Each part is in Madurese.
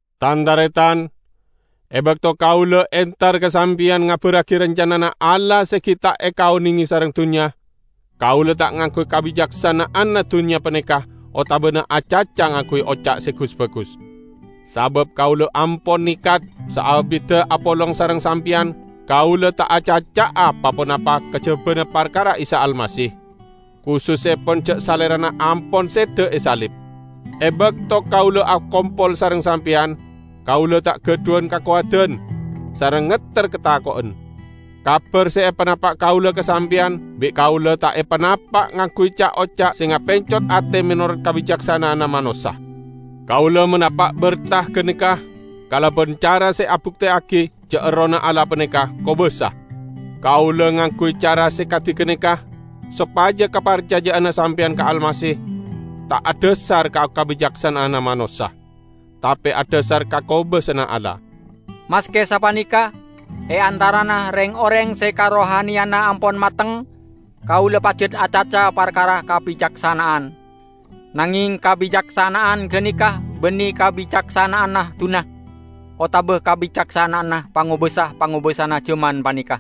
Tan-taretan! E bakto kaula entar ka sampeyan ngabarragi rancanana Allah se gi' ta' ekaonenge sareng dunnya, kaula ta' ngangguy kabicaksana'anna dunnya paneka otabana acaca ngangguy oca' se gus-bagus. Sabab kaula ampon nekat, saabidda apolong sareng sampeyan kaula ta' acaca'a pa-ponapa kajabana parkara Isa Almasih; kusussepon ja' Salerana ampon seda e salib. E bakto kaula akompol sareng sampeyan, kaula ta' gadhuwan kakowadan, sareng ngetter katako'en. Kabar se epanapa' kaula ka sampeyan bi' kaula ta' epanapa' ngangguy ca'-oca' se ngapencot ate menorot kabicaksana'anna manossa. Kaula manapa' berta ganeka kalaban cara se abukteyagi ja' Errohna Allah paneka kobasa. Kaula ngangguy cara se kadi ganeka sopaja kaparcaja'anna sampeyan ka Almasih ta' adhasar ka kabicaksana'anna manossa, tape adhasar ka kobasana Allah. Maske sapaneka, e antarana reng-oreng se karohaniyanna ampon mateng, kaula pajat acaca parkara kabicaksana'an. Nangeng kabicaksana'an ganeka banne kabicaksana'anna dunnya, otaba kabicaksana'anna pangobasa-pangobasana jaman paneka,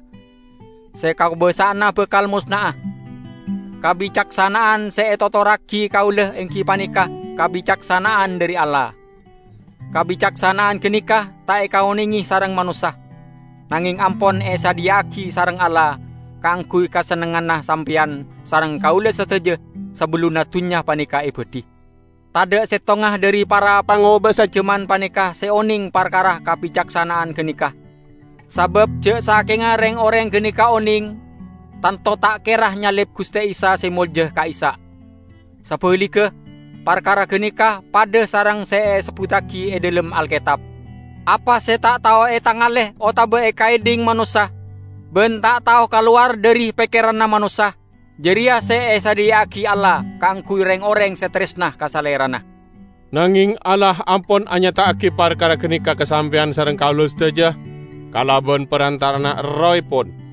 se kakobasa'anna bakal mosna'a. Kabicaksana'an se etotorragi kaula enggi paneka kabicaksana'an dhari Allah. Kabicaksana'an ganeka ta' ekaonenge sareng manossa, nangeng ampon esadhiya'agi sareng Allah kaangguy kasennengnganna sampeyan sareng kaula sadaja sabellunna dunnya paneka ebadhi. Tadha' settonga dhari para pangobasa jaman paneka se oneng parkara kabicaksana'an ganeka. Sabab ja' sakenga reng-oreng ganeka oneng, tanto ta' kera nyalib Guste Isa se molja ka'issa'. Sabaligga, parkara ganeka padha sareng se esebbuttagi e dhalem Alketab, "Apa se ta' tao etangale otaba ekaedhing manossa, ban ta' tao kalowar dhari pekkeranna manossa, jareya se esadhiya'agi Allah kaangguy reng-oreng se taresna ka Salerana." Nangeng Allah ampon anyata'agi parkara ganeka ka sampeyan sareng kaula sadaja kalaban parantara'anna Errohepon.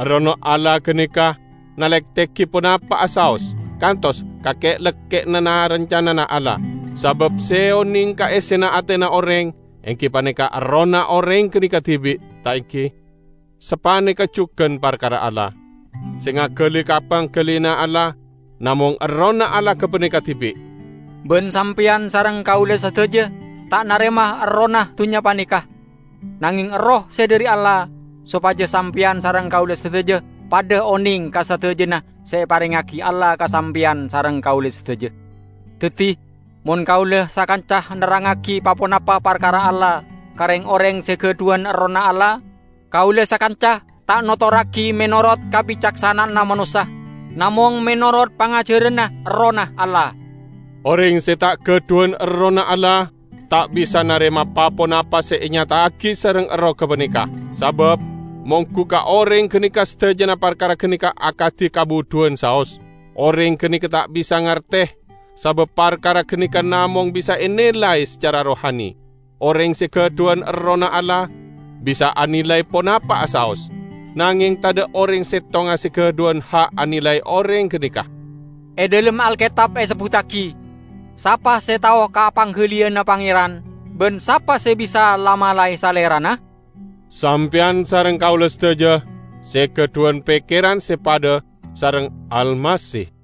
Errohna Allah ganeka nalektegi ponapa'a saos, kantos ka ke'-lekke'na na-rancanana Allah. Sabab se oneng ka essena atena oreng enggi paneka errohna oreng ganeka dibi', ta' enggi? Sapaneka jugan parkara Allah. Se ngagali ka panggaliyanna Allah namong Errohna Allah gapaneka dibi'! Ban sampeyan sareng kaula sadaja ta' narema errohna dunnya paneka, nangeng Erroh se dhari Allah, sopaja sampeyan sareng kaula sadaja padha oneng ka sadajana se eparengngagi Allah ka sampeyan sareng kaula sadaja. Daddi, mon kaula sakanca nerrangngagi pa-ponapa parkara Allah ka reng-oreng se gadhuwan Errohna Allah, kaula sakanca ta' notorragi menorot kabicaksana'anna manossa, namong menorot pangajaranna Errohna Allah. Oreng se ta' gadhuwan Errohna Allah, ta' bisa narema pa-ponapa se enyata'agi sareng Erroh gapaneka. Sabab monggu ka oreng ganeka sadajana parkara ganeka akadi kabudhuwan saos. Oreng ganeka ta' bisa ngarte, sabab parkara ganeka namong bisa enilay sacara rohani. Oreng se gadhuwan Errohna Allah bisa anilay ponapa'a saos, nangeng tadha' oreng settonga se gadhuwan ha' anilay oreng ganeka. E dhalem Alketab esebbuttagi, "Sapa se tao ka panggaliyanna Pangeran? Ban sapa se bisa la-malae Salerana?" Sampeyan sareng kaula sadaja se gadhuwan pekkeran se padha sareng Almasih!